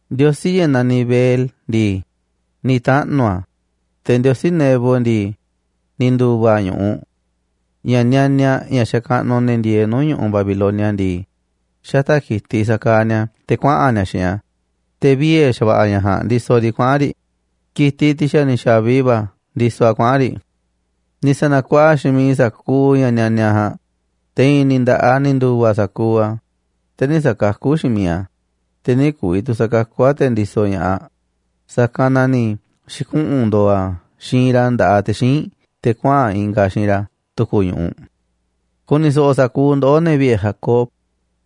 Ndiosí ña̱ naniꞌ Bel ndii, ni̱ taꞌnu̱ a̱, te̱ ndiosí Nebo ndii, ni̱ ndu̱va̱ a̱ ñu̱ꞌuꞌ. Ña̱ nianiaꞌ ña̱ xakaꞌnuꞌ ne̱ ndieeꞌ nuu̱ꞌ ñu̱ꞌuꞌ Babilonia ndii, xata̱ꞌ ki̱tiꞌ sakaaꞌ ni̱a̱ a̱ te̱ kuaꞌa̱n ni̱a̱ xiinꞌ a̱, te̱ viee̱ xa̱va̱ꞌa̱ ña̱ ja̱a̱nꞌ ndisoꞌ riꞌ kuaꞌa̱n riꞌ ki̱tiꞌ, tiꞌ xa̱ ni̱ xa̱vi va̱ ndisoꞌ a̱ kuaꞌa̱n riꞌ. Ni̱ sa̱na̱kuaꞌa xiinꞌ miiꞌ sa̱kuuꞌ ña̱ nianiaꞌ ja̱a̱nꞌ, te̱ i̱i̱n ni̱ nda̱ꞌaꞌ ni̱ ndu̱va̱ sa̱kuuꞌ a̱, te̱ nï̱ sa̱kakú xiinꞌ miiꞌ a̱, te̱ nï̱ ku̱vi̱ tu̱ sa̱kakú a̱ te̱ ndisoꞌ ña̱ꞌaꞌ, sa̱kanꞌ na ni̱ xi̱kuꞌu̱n ndo̱o̱ a̱ xiinꞌ ra̱ nda̱ꞌaꞌ te̱ xíinꞌ te̱ kuaꞌa̱n ingaꞌ a̱ xiinꞌ ra̱ tu̱ku̱ ñu̱ꞌuꞌ. “Ku̱ni̱ so̱ꞌo̱ sa̱kuuꞌ ndoꞌó, ne̱ vi̱ꞌe̱ Jacob,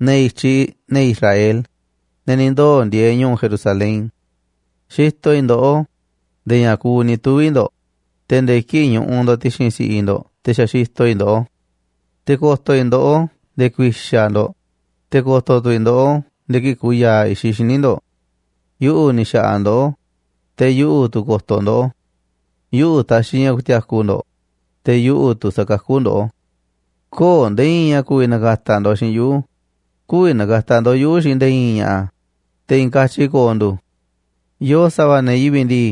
ne̱ i̱tyiꞌ ne̱ Israel, ne̱ ni̱ ndoo̱ ndieeꞌ ñu̱u̱ Jerusalén. Xitoꞌ i̱ ndoꞌó nde̱e̱ ña̱ kuuꞌ ni̱ tuvi̱ ndo̱ꞌ, te̱ nde̱e̱ kii̱ꞌ ñuꞌuꞌ ndo̱ꞌ ti̱xi̱n si̱ꞌiꞌ ndo̱ꞌ te̱ xa̱ xitoꞌ i̱ ndoꞌó. Te̱ ko̱to̱ i̱ ndoꞌó nde̱e̱ ku̱i̱xa̱ ndo̱ꞌ, te̱ ko̱to̱ tu̱ i̱ ndoꞌó nde̱e̱ kii̱ꞌ ku̱ya̱a̱ i̱xiꞌ xíniꞌ ndo̱ꞌ. Yuꞌu̱ ni̱ xa̱ꞌa̱ ndoꞌó, te̱ yuꞌu̱ tu̱ ko̱to̱ ndoꞌó. Yuꞌu̱ ta̱xi̱ ña̱ ku̱ti̱a̱ku̱ ndo̱ꞌ, te̱ yuꞌu̱ tu̱ sa̱kakú ndoꞌó. ’Köo̱ꞌ nde̱e̱ i̱i̱n ña̱ ku̱vi̱ na̱ka̱ta̱ ndo̱ꞌ xiinꞌ yuꞌu̱, kü̱vi̱ na̱ka̱ta̱ ndo̱ꞌ yuꞌu̱ xiinꞌ nde̱e̱ i̱i̱n ña̱ꞌa̱, te̱ i̱i̱n katyi ko̱o̱ ndu̱. Yoo sa̱va̱ ne̱ yivi̱ꞌ ndii,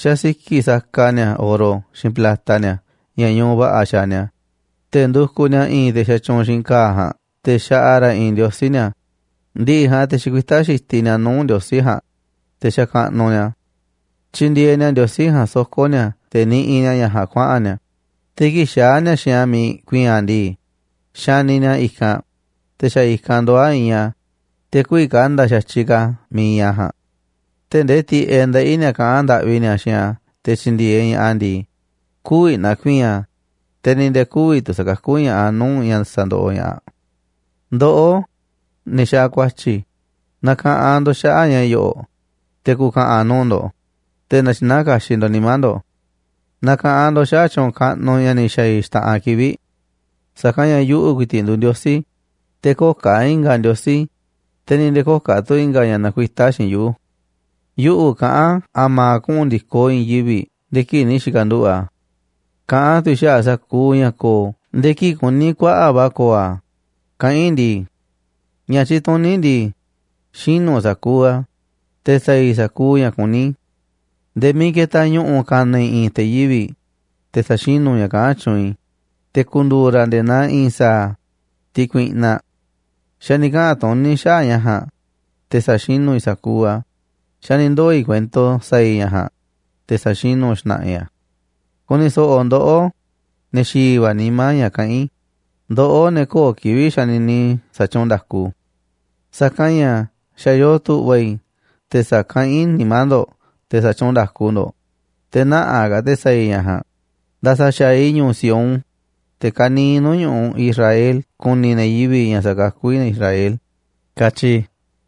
xasiki̱ꞌ saka ni̱a̱ oro xiinꞌ plata ni̱a̱ ña̱ ñuꞌuꞌ va̱ꞌa̱ xaaꞌ ni̱a̱, te̱ ndukuꞌ ni̱a̱ i̱i̱n te̱ xatyuunꞌ xiinꞌ ka̱a̱ ja̱a̱nꞌ te̱ xaꞌa ra̱ i̱i̱n ndiosí ni̱a̱. Ndi̱ꞌi̱ ja̱a̱nꞌ te̱ xikuitá xitiꞌ ni̱a̱ nuu̱ꞌ ndiosí ja̱a̱nꞌ, te̱ xakaꞌnuꞌ ni̱a̱ a̱. Tyindieeꞌ ni̱a̱ ndiosí ja̱a̱nꞌ soko̱ ni̱a̱ te̱ niꞌiꞌ ni̱a̱ ña̱ ja̱a̱nꞌ kuaꞌa̱n ni̱a̱, te̱ kii̱ꞌ xaa̱ ni̱a̱ xiinꞌ a̱ miiꞌ ku̱i̱i̱n a̱ ndii, xaniꞌ ni̱a̱ a̱ i̱kanꞌ, te̱ xa̱ i̱kanꞌ ndoo̱ a̱ iinꞌ a̱, te̱ kü̱vi̱ ka̱nda̱ a̱ xa̱tyiꞌ ka̱ a̱ miiꞌ iinꞌ a̱ ja̱a̱nꞌ. Tee̱ꞌ ndee tiꞌeꞌ ndeꞌí ni̱a̱ kaꞌán ndaꞌvi ni̱a̱ xiinꞌ a̱ te̱ tyi̱ndi̱e̱eꞌ ña̱ꞌaꞌ a̱ ndii, kü̱vi̱ na̱ku̱i̱i̱n a̱, te̱ ni̱ nde̱e̱ kü̱vi̱ tu̱ sa̱kakú ña̱ꞌaꞌ a̱ nuu̱ꞌ ña̱ sa̱ndoꞌoꞌ ña̱ꞌaꞌ. ’Ndoꞌó, ne̱ xaaꞌ ku̱a̱tyi̱, na̱ka̱ꞌanꞌ ndo̱ꞌ xaꞌa̱ꞌ ña̱ yo̱ꞌo̱ꞌ, te̱ ku̱ka̱ꞌa̱n nuu̱ꞌ ndo̱ꞌ, te̱ na̱tyi̱naá kaxiꞌ ndo̱ꞌ nimá ndo̱ꞌ. Na̱ka̱ꞌanꞌ ndo̱ꞌ xaꞌa̱ꞌ tyu̱u̱n kaꞌnuꞌ ña̱ ni̱ xa̱a̱ i̱ xta̱ꞌanꞌ kivi̱ꞌ. Sa̱kanꞌ ña̱ yuꞌu̱ ku̱i̱ti̱ꞌ nduuꞌ Ndiosí, te̱ köo̱ꞌ ka̱ i̱nga̱ ndiosí, te̱ ni̱ nde̱e̱ köo̱ꞌ tu̱ i̱nga̱ ña̱ nakuitá xiinꞌ yuꞌu̱. Yuꞌu̱ kaꞌán a̱ma̱a̱ kuꞌu̱n ndi̱koꞌ i̱i̱n yivi̱ꞌ nde̱e̱ kii̱ꞌ ni̱ xi̱ka̱nduꞌu̱ꞌ a̱. Kaꞌán tu̱ i̱ xaꞌa̱ꞌ sa̱kuuꞌ ña̱ ko̱o̱ nde̱e̱ kii̱ꞌ kuní kuaꞌa̱ꞌ va̱ ko̱o̱ a̱, kaꞌán i̱ ndii: Ña̱ tyituní i̱ ndii, xinu̱ sa̱kuuꞌ a̱, te̱ sa̱a̱ i̱ sa̱kuuꞌ ña̱ kuní i̱. Nde̱e̱ miiꞌ ketaꞌ ñu̱ꞌu̱ ka̱na̱ i̱ i̱i̱n te̱ yivi̱ꞌ, te̱ sa̱xinu̱ ña̱ kaꞌán tyuunꞌ i̱, te̱ ku̱ndu̱u̱ ra̱ nde̱e̱ naa i̱i̱n sa̱a̱, tiꞌ kuiꞌnaꞌ. Xa̱ ni̱ kaꞌa̱n tuní i̱ xaꞌa̱ꞌ ña̱ ja̱a̱nꞌ, te̱ sa̱xinu̱ i̱ sa̱kuuꞌ a̱, xa̱ ni̱ ndoo̱ i̱ kuento sa̱a̱ i̱ ña̱ ja̱a̱nꞌ, te̱ sa̱xinu̱ xna̱ꞌa̱ i̱ a̱. Ku̱ni̱ so̱ꞌo̱ ndoꞌó, ne̱ xi̱i̱ va̱ nimá ña̱ kaꞌán i̱, ndoꞌó, ne̱ köo̱ꞌ kivi̱ꞌ xanini sa̱tyuunꞌ nda̱ku. Sa̱kanꞌ ña̱ xa̱ yoo tu̱ꞌva̱ i̱ te̱ sa̱kaꞌán i̱ nimá ndo̱ꞌ te̱ sa̱tyuunꞌ nda̱ku ndo̱ꞌ, te̱ nä̱ꞌaꞌ ka̱ te̱ sa̱a̱ i̱ ña̱ ja̱a̱nꞌ. Nda̱sa̱ xa̱aꞌ i̱ ñu̱u̱ Sión, te̱ ka̱niiꞌ nuu̱ꞌ ñu̱ꞌuꞌ Israel ku̱ni̱ ne̱ yivi̱ꞌ ña̱ sakakú i̱ ne̱ Israel, katyi i̱.